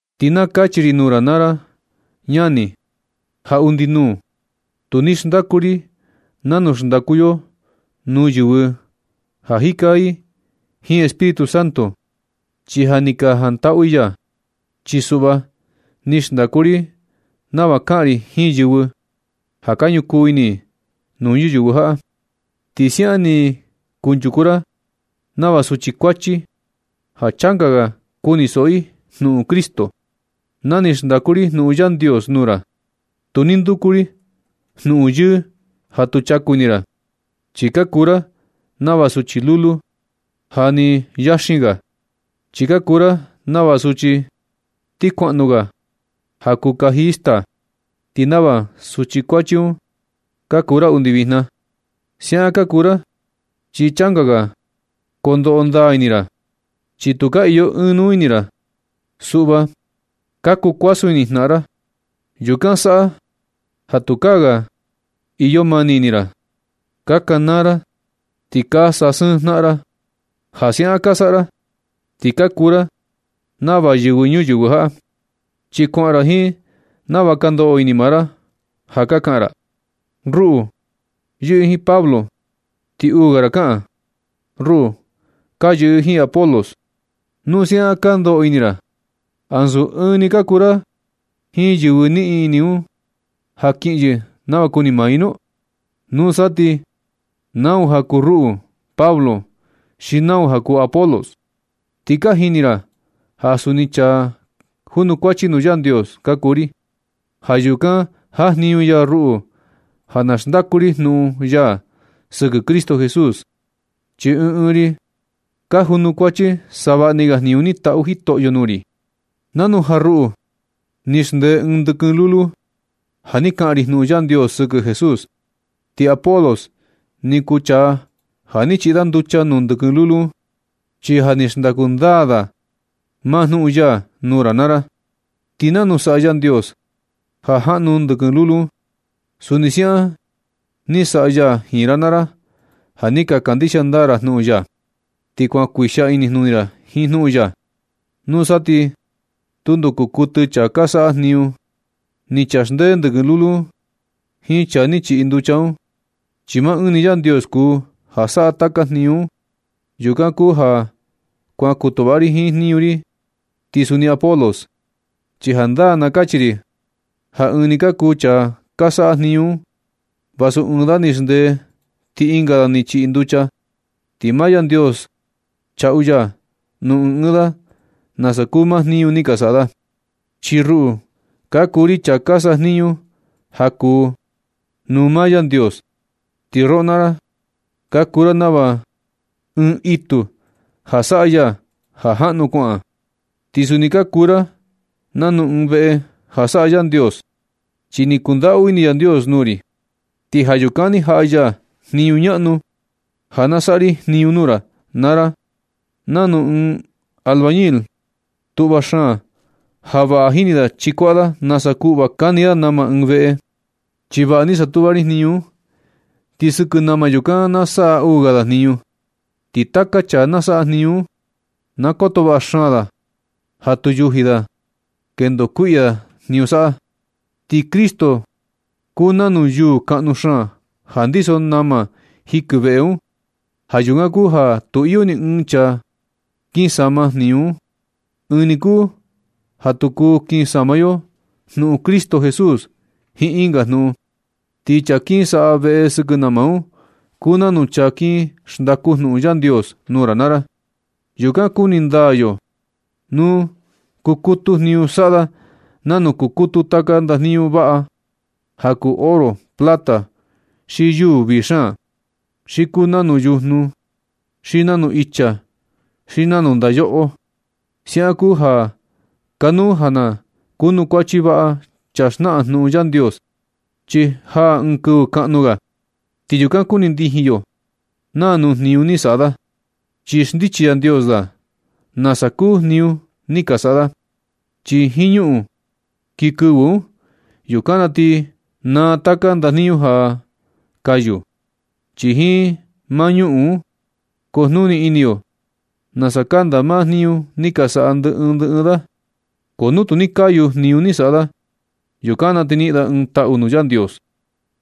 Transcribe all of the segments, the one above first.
Ti na kachi ri nuu ra naa ra ñani ja undi nuu, tu ni xndaku ri nanu xndaku yo nuu yɨvɨ ja jika i jiin Espíritu Santo, chi ja ni ka jantaꞌu i ya. Chi suꞌva ni xndaku ri nava kaꞌan ri jiin yɨvɨ ja ka ñukuu ini nuu ñuyɨvɨ jaꞌa. Ti siaꞌan ni kunchuku ra nava suchi kuachi ja changa ga kunisoꞌo i jnuꞌun Cristo. Na ni xndaku ri jnuꞌun Yandios nuu ra, tu ni nduku ri jnuꞌun yɨɨ ja tu chaku ini ra, chi ka kuu ra nava suchi lulu ja nɨ yaxin ga. Chi ka kuu ra nava suchi ti kuaꞌnu ga ja kuu kaji i staa. Ti nava suchi kuachi un ka kuu ra undi vijna. Siaꞌan ka kuu ra chi changa ga kondoꞌo ndaa ini ra, chi tu ka iyo ɨɨn nuu ini ra. Suꞌva ka kuu kuasun ini jnaꞌan ra. Yukan saꞌa ja tukaa ga ka iyo mani ini ra. Ka kanaa ra ti ka sasɨɨn jnaꞌan ra. Ja siaꞌan ka saꞌa ra ti ka kuu ra nava yɨvɨ ñuyɨvɨ jaꞌa, chi kuaꞌan ra jiin nava ka ndoꞌo ini maa ra. Ja ka kaꞌan ra: “Ruꞌu yɨꞌɨ jiin Pablo.” Ti uu ga ra kaꞌan: “Ruꞌu ka yɨꞌɨ jiin Apolos.” Nu siaꞌan ka ndoꞌo ini ra, ¿ansu ɨɨn ni ka kuu ra jiin yɨvɨ niꞌin ini un ja kiꞌin yɨ nava kuni maa i nu? ¿Nusa ti nau ja kuu ruꞌu Pablo xi nau ja kuu Apolos? Ti ja ka jini ra ja suni chaa junukuachi nuu Yandios ka kuu ri. Ja yukan jajniñu ya ruꞌu ja na xndaku ri jnuꞌun ya sɨkɨ Cristo Jesús. Chi ɨɨn ɨɨn ri ka junukuachi savaꞌni ga jniñu ni tatu Jitoꞌyo nuu ri. Nanu ja ruꞌu ni xndee ɨɨn ndɨkɨn lulu ja ni kaꞌan ri jnuꞌun Yandios sɨkɨ Jesús. Ti Apolos ni kuu chaa ja ni chiꞌi da nducha nuu ndɨkɨn lulu un, chi ja ni xndaku ndaa da maa jnuꞌun ya nuu ra naa ra. Ti nanu saꞌa Yandios ja jaꞌnu ndɨkɨn lulu un, suni siaꞌan ni saꞌa ya jiin ra naa ra ja ni ka kandixia ndaa ra jnuꞌun ya. Ti kuan kuixia inijnuni ra jiin jnuꞌun ya. Nusa ti tundo kuu kuɨtɨ chaa ka saꞌa jniñu. Ni chaa xndee ndɨkɨn lulu un jiin chaa ni chiꞌi nducha un, chi maa ɨɨn ni Yandios kuu ja saꞌa taka jniñu un. Yukan kuu ja kuan kutuꞌva ri jiin jniñu ri, ti suni Apolos. Chi jandaa na kachi ri ja ɨɨn ni ka kuu chaa ka saꞌa jniñu un vasu ɨɨn da ni xndee ti ɨnga ni chiꞌi nducha, ti maa Yandios chaꞌu ya nuu ɨɨn ɨɨn da nasa kuu maa jniñu ni ka saꞌa da. Chi ruꞌu ka kuu ri chaa ka sajniñu ja kuu nuu maa Yandios. Ti roꞌo naa ra ka kuu ra nava un itu ja saꞌa ya ja jaꞌnu kuaꞌa. Ti suni ka kuu ra nanu ɨɨn veꞌe ja saꞌa Yandios. Chi ni kundaꞌu ini Yandios nuu ri, ti ja yukan ni jaꞌa ya jniñu ñaꞌnu ja na saꞌa ri jniñu nuu ra, naa ra nanu ɨɨn albañil tuꞌva xaan ja vaꞌa jini da chikuaꞌa da nasa kuꞌva kani da nama ɨɨn veꞌe. Chi vaꞌa ni satuꞌva ri jniñu un, ti sɨkɨ nama yukan na saꞌa uu ga da jniñu. Ti taka chaa na saꞌa jniñu un, na koto vaꞌa xaan da ja tu yuji da kendo kuiꞌya jniñu saꞌa da. Ti Cristo kuu nanu yuu kaꞌnu xaan ja ndiso nama jikɨ veꞌe un. Ja yukan kuu ja tu iyo ni ɨɨn chaa kin sama jniñu un. Ɨɨn ni kuu ja tu kuu kin sama yo jnuꞌun Cristo Jesús jiin ɨnga jnuꞌun. Ti chaa kin saꞌa veꞌe sɨkɨ nama un, kuu nanu chaa kin xndaku jnuꞌun Yandios nuu ra naa ra. Yukan kuni ndaa yo nu kukutu jniñu saꞌa da nanu kukutu taka ndajniñu vaꞌa ja kuu oro, plata, xi yuu vii xaan. Xi kuu nanu yujnu, xi nanu icha, xi nanu ndayoꞌo. Siaꞌan kuu ja kanuu ja na kunukuachi vaꞌa chaa xnaꞌan jnuꞌun Yandios, chi jaa ɨɨn kɨvɨ kaꞌnu ga, ti yukan kuni ndijin yo naa nuu jniñu ni saꞌa da. Chi xndichi Yandios da nasa kuu jniñu ni ka saꞌa da, chi jiin ñuꞌun kii kɨvɨ un. Yukan na ti naa taka ndajniñu ja kayu, chi jiin maa ñuꞌun un kujnuni ini yo nasa kanda maa jniñu ni ka saꞌa ndɨ ɨɨn ndɨ ɨɨn da. Ko nu tu ni kayu jniñu ni saꞌa da, yukan na ti niꞌin da ɨɨn taꞌu nuu Yandios.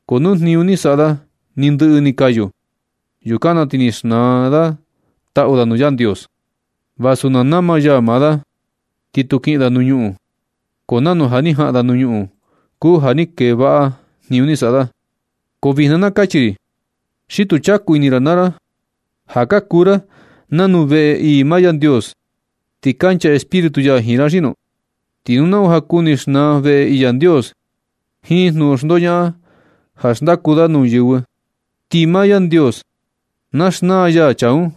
Ko nu jniñu ni saꞌa da ni ndɨꞌɨ ni kayu, yukan na ti ni xnaa da taꞌu da nuu Yandios. Vasu na nama ya maa da ti tu kiꞌin da nuu ñuꞌun, ko nanu ja ni jaꞌan da nuu ñuꞌun kuu ja tu ni kee vaꞌa jniñu ni saꞌa da. ¿Ko vijna na kachi ri, xi tu chaku ini ra naa ra ja ka kuu ra nanu veꞌe ii maa Yandios, ti kancha Espíritu ya jiin ra xi nu? Ti nu nau ja kuni xnaa veꞌe ii Yandios jiin jnuꞌun xndoñaꞌan ja xndaku da nuu yɨvɨ, ti maa Yandios na xnaa ya chaa un.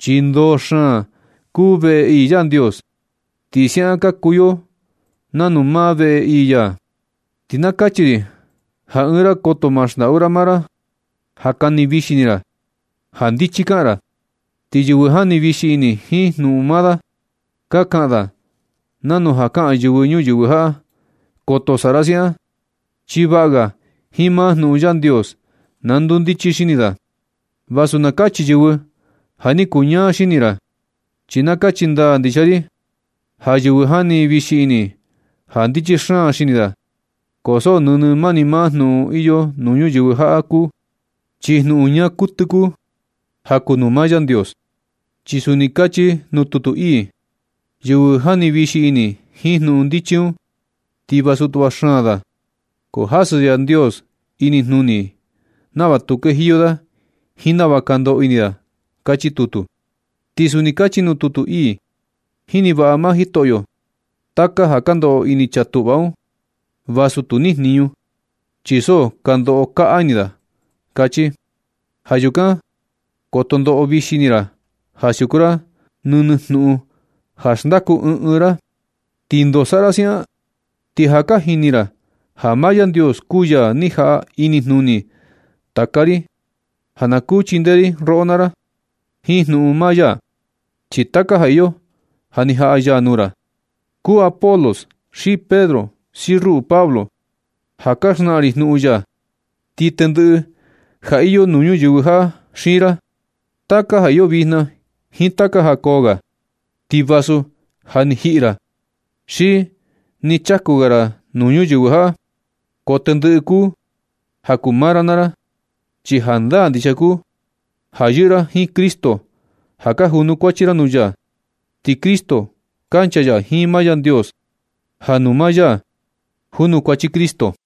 Chi ndoo xaan kuu veꞌe ii Yandios. Ti siaꞌan ka kuu yo nanu maa veꞌe ii ya. Ti na kachi ri ja ni ɨɨn ra koto ma xndaꞌu ra maa ra ja kani vixi ini ra ja ndichi kaꞌan ra, chi yɨvɨ jani vixi ini jiin jnuꞌun maa da, ka kaꞌan da nanu ka kaꞌan yɨvɨ ñuyɨvɨ jaꞌa. Koto saꞌa ra siaꞌan, chi vaꞌa ga jiin maa jnuꞌun Yandios na ndundichi xini da, vasu na kachi yɨvɨ ja ni kuñaa xini ra. Chi na kachi ndaa ndixia ri ja yɨvɨ jani vixi ini ja ndichi xaan xini da, ko so nɨnɨ mani maa jnuꞌun iyo nuu ñuyɨvɨ jaꞌa kuu, chi jnuꞌun ñaa kuɨtɨ kuu ja kuu nuu maa Yandios. Chi suni kachi nuu tutu ii: “Yɨvɨ jani vixi ini jiin jnuꞌun ndichi un ti vasu tuꞌva xaan da, ko jasɨ Yandios inijnuni i nava tu kejiyo da jiin nava ka ndoꞌo ini da”, kachi tutu. Ti suni kachi nuu tutu ii: “Jini vaꞌa maa Jitoꞌyo taka ja ka ndoꞌo ini chaa tuꞌva un, vasu tu nijniñu chi so ka ndoꞌo kaꞌa ini da”, kachi. Ja yukan koto ndoꞌo vixi ini ra ja siuku ra nɨnɨ jnuꞌun ja xndaku ɨɨn ɨɨn ra. ¿Ti ndoo saꞌa ra siaꞌan? Ti ja ka jini ra ja maa Yandios kuu ya ni jaꞌa inijnuni taka ri ja na kuu chindee ri roꞌo naa ra jiin jnuꞌun maa ya, chi taka ja iyo ja ni jaꞌa ya nuu ra, kuu Apolos, xi Pedro, xi ruꞌu Pablo ja ka xnaꞌan ri jnuꞌun ya, ti tendɨꞌɨ ja iyo nuu ñuyɨvɨ jaꞌa xiin ra. Taka ja iyo vijna jiin taka ja koo ga, ti vasu ja ni jiꞌi ra xi nɨ chaku ga ra nuu ñuyɨvɨ jaꞌa, ko tendɨꞌɨ kuu ja kuu maa ra naa ra. Chi jandaa ndixia kuu ja yɨꞌɨ ra jiin Cristo ja ka junukuachi ra nuu ya, ti Cristo kancha ya jiin maa Yandios, ja nuu maa ya junukuachi Cristo.